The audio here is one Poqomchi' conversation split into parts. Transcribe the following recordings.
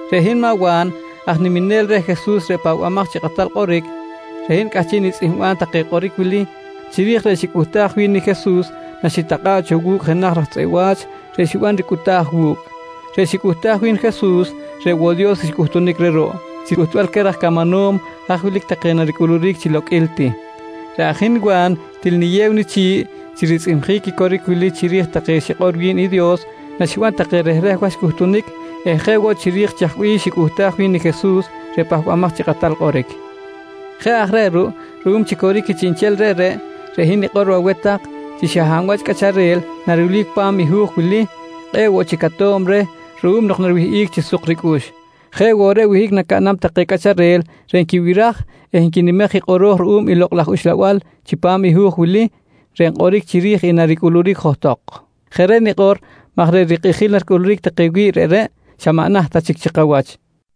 Reꞌ hin maꞌ Wa̱n aj niminel reh Jesus reꞌ Pahbamaj chi Kꞌatal Kꞌoric, reꞌ hin cꞌahchiꞌ nitzꞌihmbam take kꞌoric wili chiri̱j reꞌ xicꞌuhtaj wi̱n i Jesus naxitakꞌa̱ꞌ cho wu̱cꞌ jenaj raj tzꞌeꞌ wa̱ch reꞌ xiban ricꞌuta̱j wu̱cꞌ. Reꞌ xicꞌuhtaj wi̱n i Jesus reꞌ woꞌ i Dios xcꞌuhtunic reh ruꞌ, chi cꞌuhtbal queh raj camanom haj wilic take naricꞌuluric chi loqꞌuil ti. Reꞌ aj i hin Wa̱n til niyew nichi̱ꞌ chi ritzꞌihmjic i coric wili chiri̱j take xikꞌor wi̱n i Dios naxiban take rehreh wach cꞌuhtunic eh jeꞌ woꞌ chiri̱j i chaj bih xicꞌuhtaj wi̱n i Jesus reꞌ Pahbamaj chi Kꞌatal Kꞌoric. Jeꞌ aj reꞌ ruꞌ, ruꞌum chi coric i chiꞌnchel reꞌreꞌ, reꞌ hin nikꞌor aweh tak chi xa hab wach cꞌacharel narilbic pa̱m i hu̱j wili, kꞌe̱ꞌ woꞌ chic ato̱b reh ruꞌum nok nariwihꞌic chi suk ricꞌux. Jeꞌ woꞌ reꞌ wihꞌic nacaꞌnam take cꞌacharel reꞌ nquibiraj eh nquinimej i kꞌoro̱j ruꞌum i Lokꞌ laj Uxlabal chipam i hu̱j wili reꞌ nkꞌoric chiri̱j i naricꞌuluric johtok. Jeꞌ reꞌ nikꞌor maj reꞌ rikꞌijil naricꞌuluric take wi̱ꞌ reꞌreꞌ xa maꞌ naht ta chic chi kawach.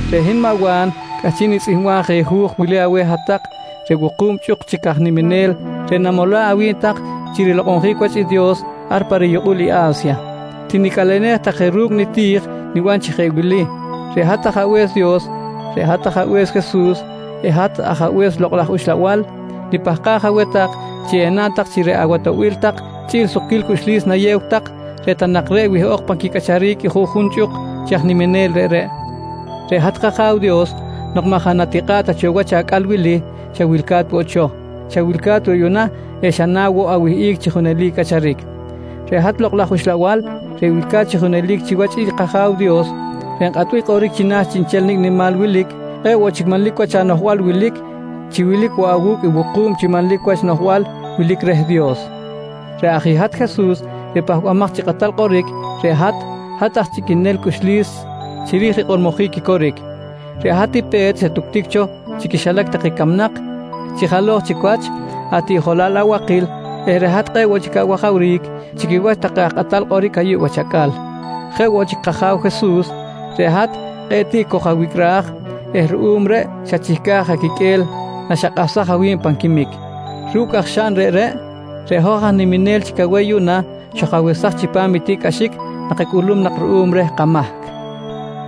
Reꞌ hin maꞌ Wa̱n cꞌahchiꞌ nitzꞌihmbam je hu̱j wili aweh hat-tak reꞌ wuku̱b chꞌuk chi aj niminel reꞌ namola̱ꞌ awi̱b tak chi rilokꞌonjic wach i Dios ar pa riyukꞌul i A̱sya. Tinicꞌalenej tak je ru̱cꞌ niti̱j niban chi jeꞌ wili: Reꞌ hat Ajabe̱s Dios, reꞌ hat Ajabe̱s Jesus eh hat Ajabe̱s Lokꞌ laj Uxlabal, nipahkaj aweh tak chi enaꞌn tak chi reꞌ awatoꞌbil tak chꞌi̱l i sukquil cꞌuxlis nayew tak reꞌ ta nak reꞌ wihꞌok pan quicꞌacharic i juꞌjun chꞌuk chi aj niminel reꞌreꞌ. Reꞌ hat kAja̱w Dios nok maꞌ jaꞌ natikꞌa̱ꞌ ta cho wach acꞌal wili, xa wilca̱t woꞌ cho, xa wilca̱t woꞌ yuꞌna eh xa na woꞌ awihꞌic chi junelic cꞌacharic. Reꞌ hat Lokꞌ laj Uxlabal reꞌ wilca̱t chi junelic chiwach i kAja̱w Dios reꞌ nkꞌatbic kꞌoric china̱ chiꞌnchel nicꞌ nimal wilic, kꞌe̱ꞌ woꞌ chic manlic wach anoꞌjbal wilic, chi wilic woꞌ awu̱cꞌ i wuku̱b chi manlic wach noꞌjbal wilic reh i Dios. Reꞌ aj i hat Jesus reꞌ Pahbamaj chi Kꞌatal Kꞌoric, reꞌ hat, hat aj chꞌiquenel cꞌuxlis chiri̱j rikꞌormojic i coric. Reꞌ hat i pe̱t xatuctic cho chi quixilac take camnak chi jalo̱j chic wach atiꞌjolal abakil eh reꞌ hat kꞌe̱ꞌ woꞌ chic awajawric chi quiwach take aj kꞌatal kꞌoric ayuꞌ wach acꞌal. Jeꞌ woꞌ chic kAja̱w Jesus, reꞌ hat kꞌe̱ꞌ tiꞌ koj-awicꞌraj eh ruꞌum reꞌ xachihcaj aquiqꞌue̱l naxakꞌahsaj awi̱b pan quimic. Ru̱cꞌ aj xaꞌn reꞌreꞌ, reꞌ hoj aj niminel chic aweh yuꞌna xoj-awesaj chipam i tiꞌcꞌaxic nakacꞌulum nak ruꞌum reh kamahc.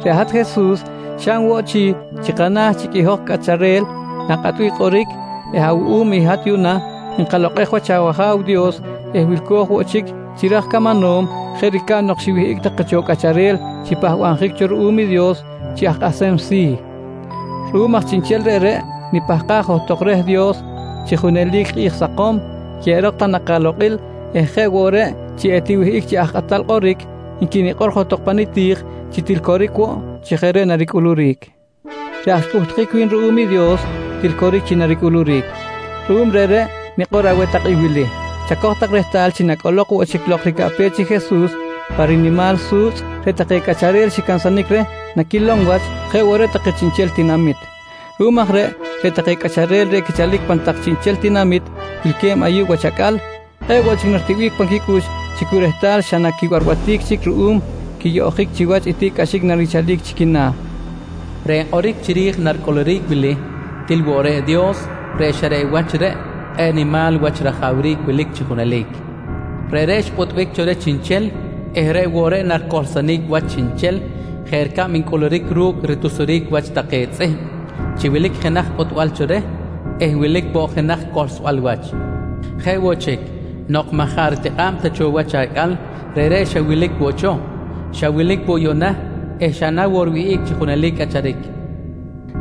Reꞌ hat Jesus xaꞌn woꞌ chi, chi kana̱ chic i hoj cꞌacharel na̱kꞌatbic kꞌoric eh awuꞌum i hat yuꞌna, nkalokꞌej wach awAja̱w Dios eh wilco̱j woꞌ chic chi raj camanom jeꞌ ricab nok xiwihꞌic take cho cꞌacharel xipahbabjic cho ruꞌum i Dios chi aj kꞌahsem si̱. Ruꞌum aj chiꞌnchel reꞌreꞌ, nipahkaj johtok reh Dios chi junelic kꞌi̱j sakom, yeꞌerok ta nak alokꞌil eh jeꞌ woꞌ reꞌ chi etiwihꞌic chi aj kꞌatal kꞌoric, nqui nikꞌor johtok pa niti̱j chi til coric woꞌ chi jeꞌ reꞌ naricꞌuluric. Reꞌ aj xcꞌuhtjic wi̱n ruꞌum i Dios til coric chi naricꞌuluric. Ruꞌum reꞌreꞌ nikꞌor aweh tak i wili: Chacoj tak rehtal chi nacꞌolok woꞌ chic lok ricaꞌpech i Jesus pa rinimal su̱tzꞌ, reꞌ take cꞌacharel xicansanic reh naquilom wach jeꞌ woꞌ reꞌ take chiꞌnchel take tinamit. Ruꞌum aj reꞌ, reꞌ take cꞌacharel reꞌ quichalic pan tak chiꞌnchel tinamit wilque̱b ayuꞌ wach acꞌal, kꞌe̱ꞌ woꞌ chic naritiꞌbic pan quicꞌux chi cu rehtal xa na quibarbatic chic ruꞌum quiyoꞌjic chiwach i tiꞌcꞌaxic narichalic chi quina̱. Reꞌ nkꞌoric chiri̱j i naricꞌuluric wili til woꞌ reꞌ i Dios reꞌ xa reꞌ wach reꞌ kꞌe̱ꞌ nimal wach rajawric wilic chi junelic. Reꞌreꞌ xpꞌutbic cho reh chiꞌnchel eh reꞌ woꞌ reꞌ naricohlsonic wach chiꞌnchel jeꞌ ricab ncꞌuluric ru̱cꞌ ritusjic wach take tzꞌihm chi wilic jenaj pꞌutbal cho reh eh wilic woꞌ jenaj cohlsbal wach. Jeꞌ woꞌ chic, nok maꞌ jaꞌ ritikꞌa̱b ta cho wach acꞌal, reꞌreꞌ xa wilic woꞌ cho, xa wilic woꞌ yuꞌna eh xa na woꞌ riwihꞌic chi junelic cꞌacharic.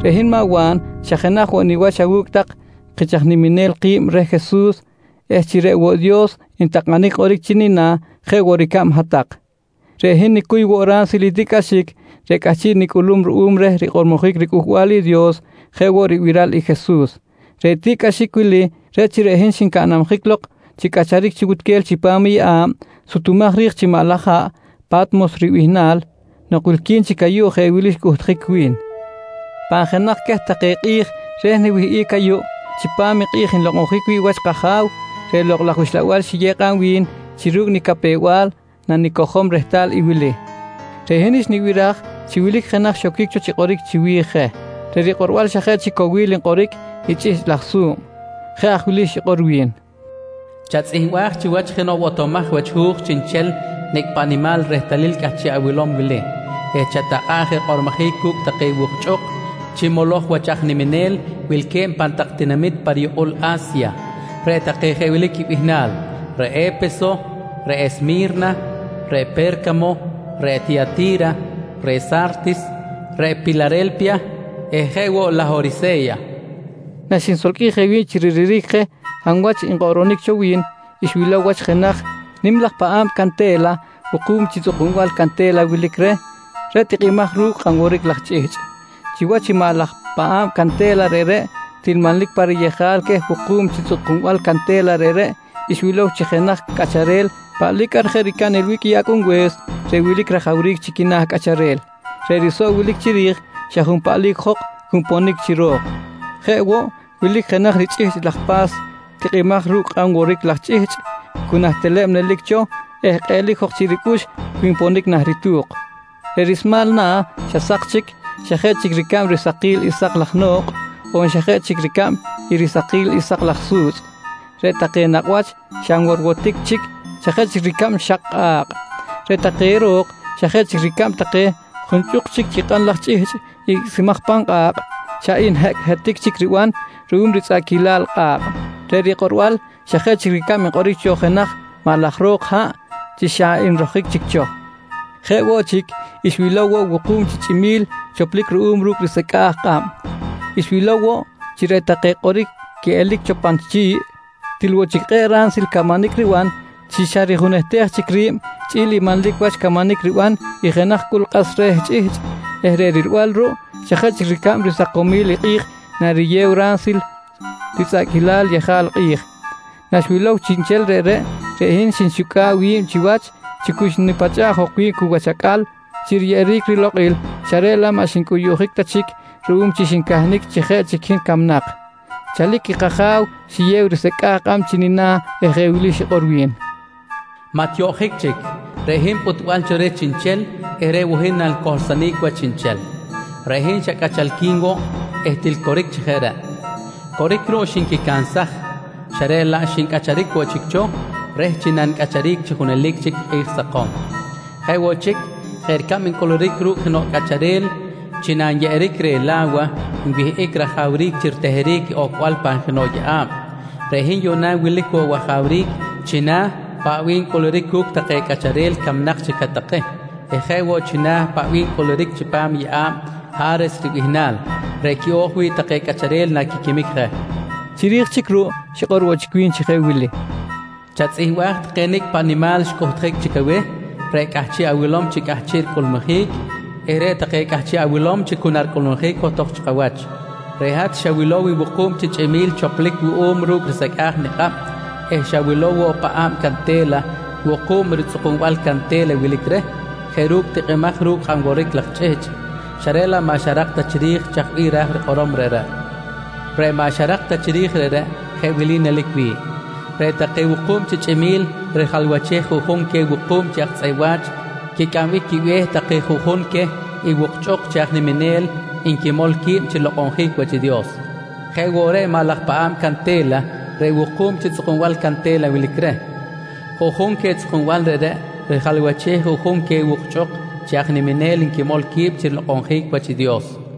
Reꞌ hin maꞌ Wa̱n xa jenaj woꞌ niwach awu̱cꞌ tak chi kich aj niminel ki̱b reh Jesus eh chi reꞌ woꞌ Dios ntakꞌanic kꞌoric chi nina̱ jeꞌ woꞌ ricab hat-tak. Reꞌ hin nicuy woꞌ ransil i tiꞌcꞌaxic reꞌ cꞌahchiꞌ nicꞌulum ruꞌum reh rikꞌormojic riCꞌuhbal i Dios jeꞌ woꞌ ribiral i Jesus. Reꞌ tiꞌcꞌaxic wili reꞌ chi reꞌ hin xincanabjic lok chi cꞌacharic chi wutquel chipam i yeꞌa̱b sutumaj ri̱j chi maꞌ laj haꞌ, Pa̱tmos ribihnal. Nok wilqui̱n chic ayuꞌ jeꞌ wili xcꞌuhtjic wi̱n: Pan jenaj queh take kꞌi̱j reh niwihꞌic ayuꞌ, chipam i kꞌi̱j nlokꞌonjic wi̱ꞌ wach i kAja̱w, reꞌ Lokꞌ laj Uxlabal xiyew kꞌab wi̱n chi ru̱cꞌ nicapew-bal nanicojom rehtal i wili: Reꞌ hin xnibiraj chi wilic jenaj xoquic cho chi kꞌoric chiwi̱j je. Reꞌ rikꞌorbal xa jeꞌ chic cowil nkꞌoric i chꞌihchꞌ laj su̱b. Jeꞌ aj wili xikꞌor wi̱n: «Chatzꞌihmbaj chiwach jenoꞌ botomaj wach hu̱j chiꞌnchel i nicꞌ paꞌ nimal i rehtalil cꞌahchiꞌ awilom wili eh chatakꞌa̱ꞌ je rikꞌormojic cu̱cꞌ take wukchꞌuk chi moloj wach aj niminel wilque̱b pan tak tinamit pa riyukꞌul A̱sya, reꞌ take jeꞌ wili quibihnal: Reꞌ E̱peso, reꞌ Esmi̱rna, reꞌ Pe̱rcamo, reꞌ Tiyati̱ra, reꞌ Sa̱rtis, reꞌ Pilare̱lpiya eh jeꞌ woꞌ i Lahorise̱ya, nqui xikꞌor. Naxinsolqꞌuij je wi̱b chi riliric je hab wach nkꞌoꞌronic cho wi̱n, xwilow wach jenaj nim laj paꞌa̱b cante̱la wuku̱b chi tzꞌukunbal cante̱la wilic reh, reꞌ tikꞌimaj ru̱cꞌ kꞌan woric laj chꞌihchꞌ. Chiwach i maꞌ laj paꞌa̱b cante̱la reꞌreꞌ, til manlic pa riyejal queh wuku̱b chi tzꞌukunbal cante̱la reꞌreꞌ xwilow chi jenaj cꞌacharel paꞌlic ar jeꞌ ricab nilbic i Acꞌunbe̱s reꞌ wilic rajawric chi quina̱ cꞌacharel. Reꞌ risoꞌ wilic chiri̱j xa junpaꞌlic jok cu nponic chi ro̱k. Jeꞌ woꞌ wilic jenaj richꞌihchꞌ laj pa̱s tikꞌimaj ru̱cꞌ kꞌan woric laj chꞌihchꞌ, cu nah teleb nelic cho eh kꞌeꞌlic jok chiꞌ ricꞌux cu nponic nah ritu̱k. Reꞌ rismal na̱ xa sak chic, xa jeꞌ chic ricab risakil i sak laj no̱kꞌ on xa jeꞌ chic ricab i risakil i sak laj su̱tzꞌ. Reꞌ take nakꞌ wach xa nworwotic chic xa jeꞌ chic ricab xak i kꞌa̱kꞌ. Reꞌ take ro̱k xa jeꞌ chic ricab take junchꞌuk chic kꞌan laj chꞌihchꞌ icꞌsimaj pan kꞌa̱kꞌ, xa nhecꞌhetic chic riban ruꞌum ritzꞌaꞌquilal kꞌa̱kꞌ. Reꞌ rikꞌorbal xa jeꞌ chic ricab nkꞌoric cho jenaj maꞌ laj ro̱k haꞌ chi xa nrojic chic cho. Jeꞌ woꞌ chic, xwilow woꞌ wuku̱b chi chꞌimi̱l choplic ruꞌum ru̱cꞌ risecꞌa̱j kꞌab. Xwilow woꞌ chi reꞌ take kꞌoric quiꞌelic cho pan chi̱ꞌ til woꞌ chic kꞌe̱ꞌ ransil camanic riban chi xa rijunehtej chic ri̱b chꞌi̱l i manlic wach camanic riban i jenaj cꞌul kꞌas re̱ chꞌihchꞌ eh reꞌ rilbal ruꞌ xa jeꞌ chic ricab risakomil i kꞌi̱j nariyew ransil ritzꞌaꞌquilal yejal kꞌi̱j. Naxwilow chiꞌnchel reꞌreꞌ, reꞌ hin xnixucꞌa̱ꞌ wi̱b chiwach chi cu xnipachꞌa̱ꞌ jok wi̱b cu wach acꞌal chi riyeꞌeric rilokꞌil xa reꞌ laꞌ maꞌ xincꞌuyuꞌjic ta chic ruꞌum chi xincahnic chi jeꞌ chic hin camnak. Chalic i kAja̱w xiyew risecꞌa̱j kꞌab chi nina̱ eh jeꞌ wili xikꞌor wi̱n: «Maꞌ tiyoꞌjic chic. Reꞌ hin i pꞌutbal cho reh chiꞌnchel eh reꞌ woꞌ hin nanicohlsonic wach chiꞌnchel. Reꞌ hin xa cꞌachalqui̱n woꞌ eh til coric chi jeꞌ reꞌ. Coric ruꞌ, xinquicansaj xa reꞌ laꞌ xincꞌacharic woꞌ chic cho reh chi nanicꞌacharic chi junelic chic kꞌi̱j sakom. Jeꞌ woꞌ chic, jeꞌ ricab ncꞌuluric ru̱cꞌ jenoꞌ cꞌacharel chi nanyeꞌeric reh i la̱wa nwihꞌic rajawric chi riteheric i ocbal pan jenoꞌ yeꞌa̱b, reꞌ hin yuꞌna wilic woꞌ wajawric china̱ paꞌ bih ncꞌuluric cu̱cꞌ take cꞌacharel camnak chic je take eh jeꞌ woꞌ china̱ paꞌ bih ncꞌuluric chipam i yeꞌa̱b “Ha̱res” ribihnal, reꞌ quiꞌo̱j wi̱ꞌ take cꞌacharel naquiquimic je, nqui wi̱n. Chiri̱j chic ruꞌ xikꞌor woꞌ chic wi̱n chi jeꞌ wili: «Chatzꞌihmbaj take nicꞌ paꞌ nimal xcꞌuhtjic chic aweh reꞌ cꞌahchiꞌ awilom chi cꞌahchiꞌ ricꞌulmujic eh reꞌ take cꞌahchiꞌ awilom chi cu naricꞌulmujic johtok chi kawach. Reꞌ hat xawilow i wuku̱b chi chꞌimi̱l choplic wuꞌum ru̱cꞌ risecꞌa̱j nikꞌab eh xawilow woꞌ i paꞌa̱b cante̱la wuku̱b ritzꞌukunbal cante̱la wilic reh jeꞌ ru̱cꞌ tikꞌimaj ru̱cꞌ kꞌan woric laj chꞌihchꞌ xa reꞌ laꞌ maꞌ xarak ta chiri̱j chaj bih ra̱j rikꞌorom reꞌreꞌ. Reꞌ maꞌ xarak ta chiri̱j reꞌreꞌ jeꞌ wili nelic wi̱ꞌ: Reꞌ take wuku̱b chi chꞌimi̱l rijalwachej i juꞌjun queh wuku̱b chi aj tzꞌeꞌ wa̱ch quicꞌambic quibe̱h take juꞌjun queh i wukchꞌuk chi aj niminel nquimol qui̱b chi rilokꞌonjic wach i Dios. Jeꞌ woꞌ reꞌ i maꞌ laj paꞌa̱b cante̱la reꞌ wuku̱b chi tzꞌukunbal cante̱la wilic reh, juꞌjun queh tzꞌukunbal reꞌreꞌ rijalwachej i juꞌjun queh wukchꞌuk chi aj niminel nquimol qui̱b chi rilokꞌonjic wach i Dios, nqui wi̱n.